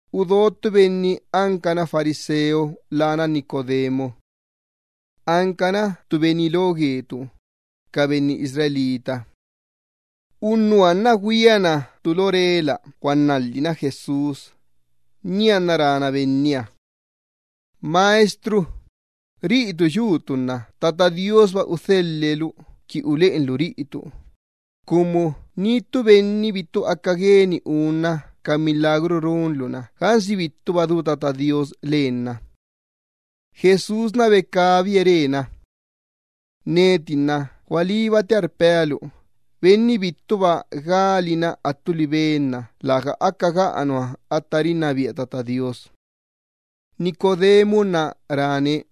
Udo ttu benni ancana fariseo lána Nicodemo. Ancana ttu benni lo gue ca benni Israel. Unnuha nna güiana ttu lo rela guannalhina Jesús, nianna rána Benniha: —Maestro, riꞌitu yutu nna Tata Do Iyyabaahaba udhelhe lu qui uleꞌenlu riꞌitu, cumu ni ttu benni bittu aca gueni unna ca milagru runlu-na gansi bittuba du Tata Do Iyyabaaha lenna. Jesús becabie re: —Neti nna gualíbatia rpea lu, benni bittuba galina attu libe nna läga aca isela nua ca benni rinnabia Tata Do Iyyabaaha. Nicodemo nna ráne: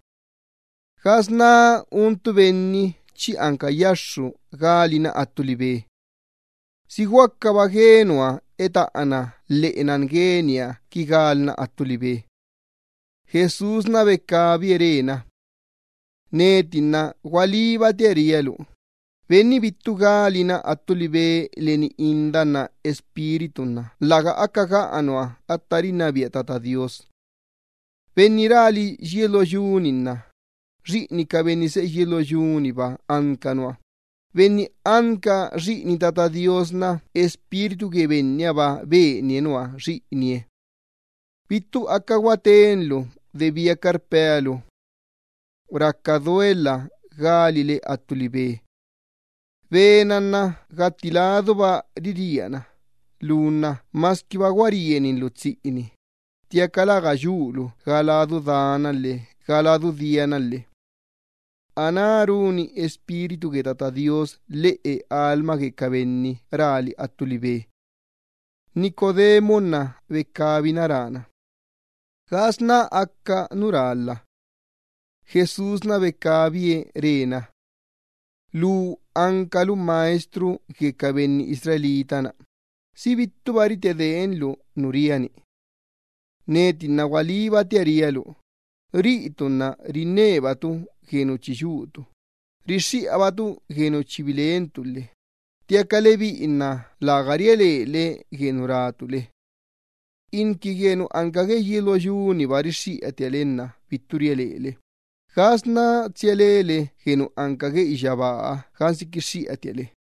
—¿Gasná un ttu benni chi anca yaxxu galna attu libe? ¿Si guacaba gue nua etaꞌana lheꞌe nan gueniha qui galna attu libe? Jesús becabie re: —Neti nna gualíbatia rpea lu, benni bittu galina attu libe leni inda nna leni Espíritu gue Tata Do Iyyabaaha nna läga aca isela nua ca benni rinnabia Tata Do Iyyabaaha. Benni rali yies lo yu-ni nna xiꞌini ca benni seꞌe yies lo yu-niba anca nua, benni anca xiꞌini Tata Do Iyyabaaha nna Espíritu gue Bennihaba benie nua xiꞌinie. Bittu aca guatenlu de biaca rpea lu: “Raca duelha galile attu libe.” Be-na gatti laduba riríana, lu nna masquiba gua rieninlu tsiꞌini, ttiaca läga yulu ga ladu dana lhe ga ladu diana lhe. Aná runi Espíritu gue Tata Do Iyyabaaha lhiꞌu lheꞌe lastoo ca benni rali attu libe. Nicodemo nna becabina rána: —¿Gasná aca nu rálha? Jesús becabie re na: —Lu ancalu maestro gue ca benni Israel-ni, ¿si bittuba ritedeenlu nu ria-ni? Neti nna gualíbatia ria lu, riꞌitu nna rinnebatu gue nu chi yutu, rixxiꞌabatu gue nu chi bilentu lhe ttiaca lebiꞌi nna läga ria lele gue nu rátu le. Inqui gue nu anca gue yies lo yu-niba rixxiꞌatia le nna bittu ria lele, ¿gasná tsia lele gue nu anca gue iyyabaaha gansi quixxiꞌatia le?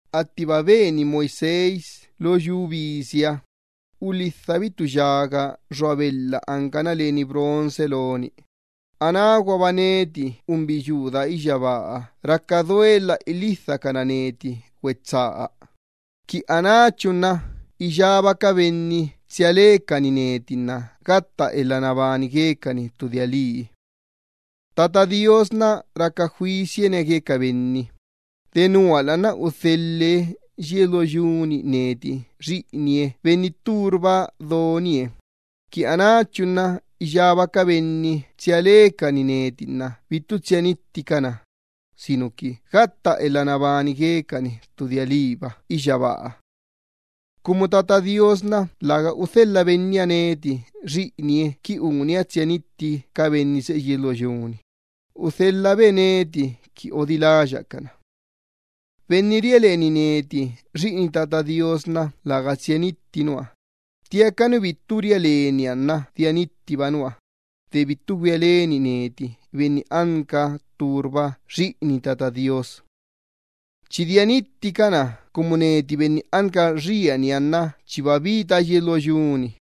Attiba beni Moisés lo yu bisiha, ulhidhabi ttu yaga xua ttu belha ancana leni bronce loni, anáguaba neti Benni unbiyuu daa iyyabaaha raca duelha ilhidhacana neti güetsaa, qui anáchu nna iyába ca benni tsia lecani neti gatta elha nabani guecani ttu dia lii. ’Tata Do Iyyabaaha nna raca juisianie gue ca benni, denuala nna udhelhe yies lo yu-ni neti Xiꞌinie Benni tturba donie, qui anáchu nna iyába ca benni tsia lecani neti nna bittu tsia nitticana, sinuqui gatta elha nabani guecani ttu dia liiba iyyabaaha. Cumu Tata Do Iyyabaaha nna läga udhelha Benniha neti Xiꞌinie-ni qui unia tsia nitti ca benni seꞌe yies lo yu-ni, udhelhabe neti qui odiláya cana. ’Benni ria leni neti Xiꞌini Tata Do Iyyabaaha, läga tsia nitti nua, ttiaca nu bittu ria leniha nna dia nittiba nua, de bittu güia leni neti Benni nu ttu cuinarba anca Xiꞌini Tata Do Iyyabaaha. Chi dia nitticana cumu neti Benni anca xieniha nna chiba bita yies lo yu-ni,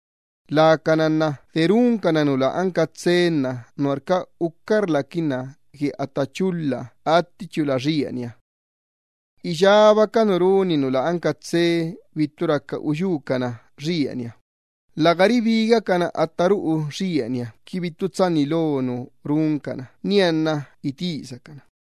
lacana nna de runcana nu lä anca tsee nuarca ucarlaquinna gue atta chulha attichula gue xieniha. Iyába ca nu runi nu lä anca tsee bittu raca uyúcana xieniha, läga ribigacana atta ruꞌu xieniha qui bittu tsanni lo nu runcana nianna itisacana.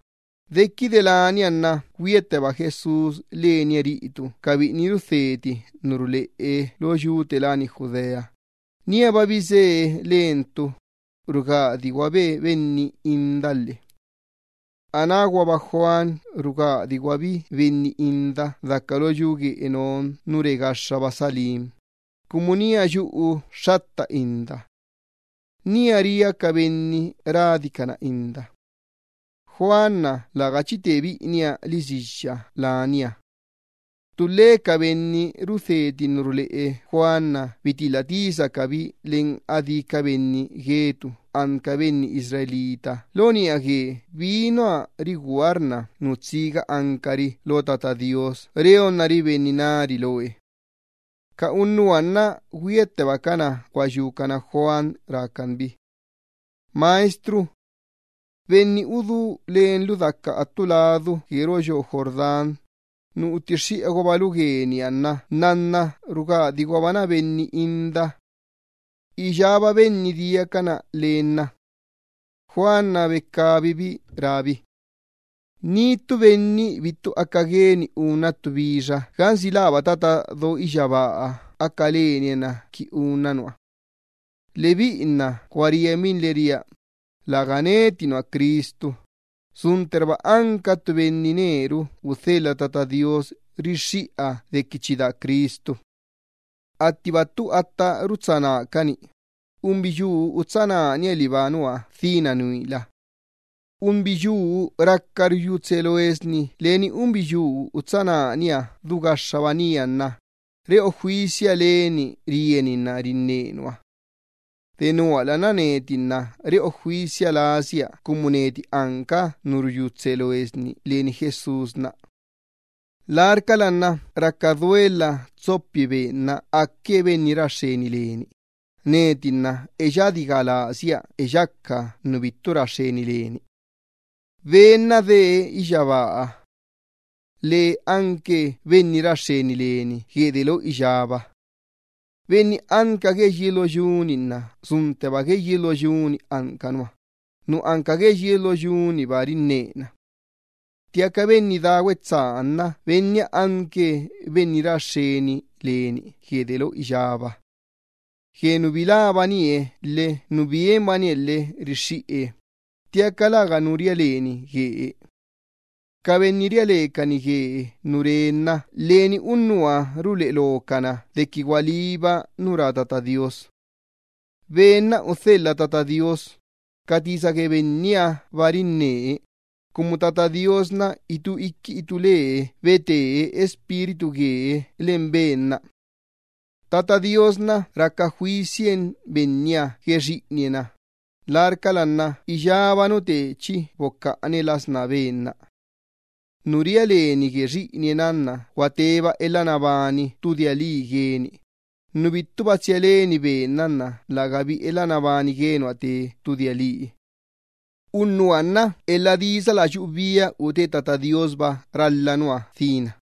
Dequide lania nna güiatteba Jesús lenie ca biꞌini rudheti ca tisa ruleꞌe lo yu gue Judea, níaba bisee lenie ca biꞌiniha, rugadi guabe benni inda lhe. Anáguaba Juan rugadiguabi benni inda daca lo yu te láni Enón nu re gaxxaba lo yu nu te láni Salim, cumu nía yuꞌuxxatta inda. Nía ria ca benni radicana inda. Juan läga chi te biꞌiniha lisiyya lania. Ttulhe ca benni rudheti ca tisa ruleꞌe Juan bitilha tisacabi leni adí ca benni Israel lo niꞌa gue bi nua rigúarna nu tsiga ancari lo Tata Do Iyyabaaha qui reacari benni nari loe. Ca unnuha nna güiattebacana guayúcana Juan rácan bi: —Maestro, benni udú lenlu daca attu ladu gue roꞌo yoo Jordán, nu utixxiꞌaguabalu gueniha, nnanna nna rugadiguabana benni inda. Iyába benni diacana len lana. Juan becabibi rábi: —Ni ttu benni bittu aca gueni unna ttu bixa gansi läba Tata do iyyabaaha aca lanie na qui unna nua. Lebiꞌi nna gua rienbinle ria, läga neti nua Cristu, suntterba anca ttu benni neru udhelha Tata Do Iyyabaaha rixxiꞌa dequi chi daa Cristu. Attiba ttu atta rutsá nácani, unbiyuu utsá nániha liba nua dhína nuila. Unbiyuu raca ruyú tsee loesni leni unbiyuu utsá nániha du gaxxaba nía nna reꞌo juisia leni rieninna rinne nua. Denuala nna neti nna reꞌo juisia lasia cumu neti anca nu ruyú tsee loesni leni Jesús. Larcala nna raca duelha eꞌeyu Ben-na aque Benni ra xxeni leni, neti nna eyadi ga lasia eyaca nu bittu ra xxeni leni. ’Ben-na dee iyyabaaha. Lee anque benni ra xxeni leni gue delo iyába. Benni anca gue yies lo yu-ni nna suntteba gue yies lo yu-ni anca nua, nu anca gue yies lo yu-niba rinnena. Ttiaca Benni daa iyyabaa nna Benniha anque Benni ra xxeni leni gue delo iyába. Gue nu bilábanie lhe nu bienbanie lhe rixxiꞌe, ttiaca läganu ria leni guee. Ca benni ria lecani gue nu rá Ben-na nna leni unnuha ruleꞌe locana dequi gualíba nu rá Tata Do Iyyabaaha. Ben-na anque Benni udhelha Tata Do Iyyabaaha, ca tisa gue Bennihaba rinnee, cumu Tata Do Iyyabaaha nna itú iqui itú lee bete Espíritu guee len Ben-na. Tata Do Iyyabaaha nna raca juisien Benniha gue Xiꞌinie-na, larcala nna iyába nu tee chi bocaꞌane las ná Ben-na. Nu ria leni gue Xiꞌinie-na gua teba elha nabani ttu dia lii gueni, nu bittuba tsia leni Ben-na nna lägabi elha nabani gue nua te ttu dia lii. Unnuha nna elha disa la yuꞌubia ute Tata Do Iyyabaahaba ralha nua dhína.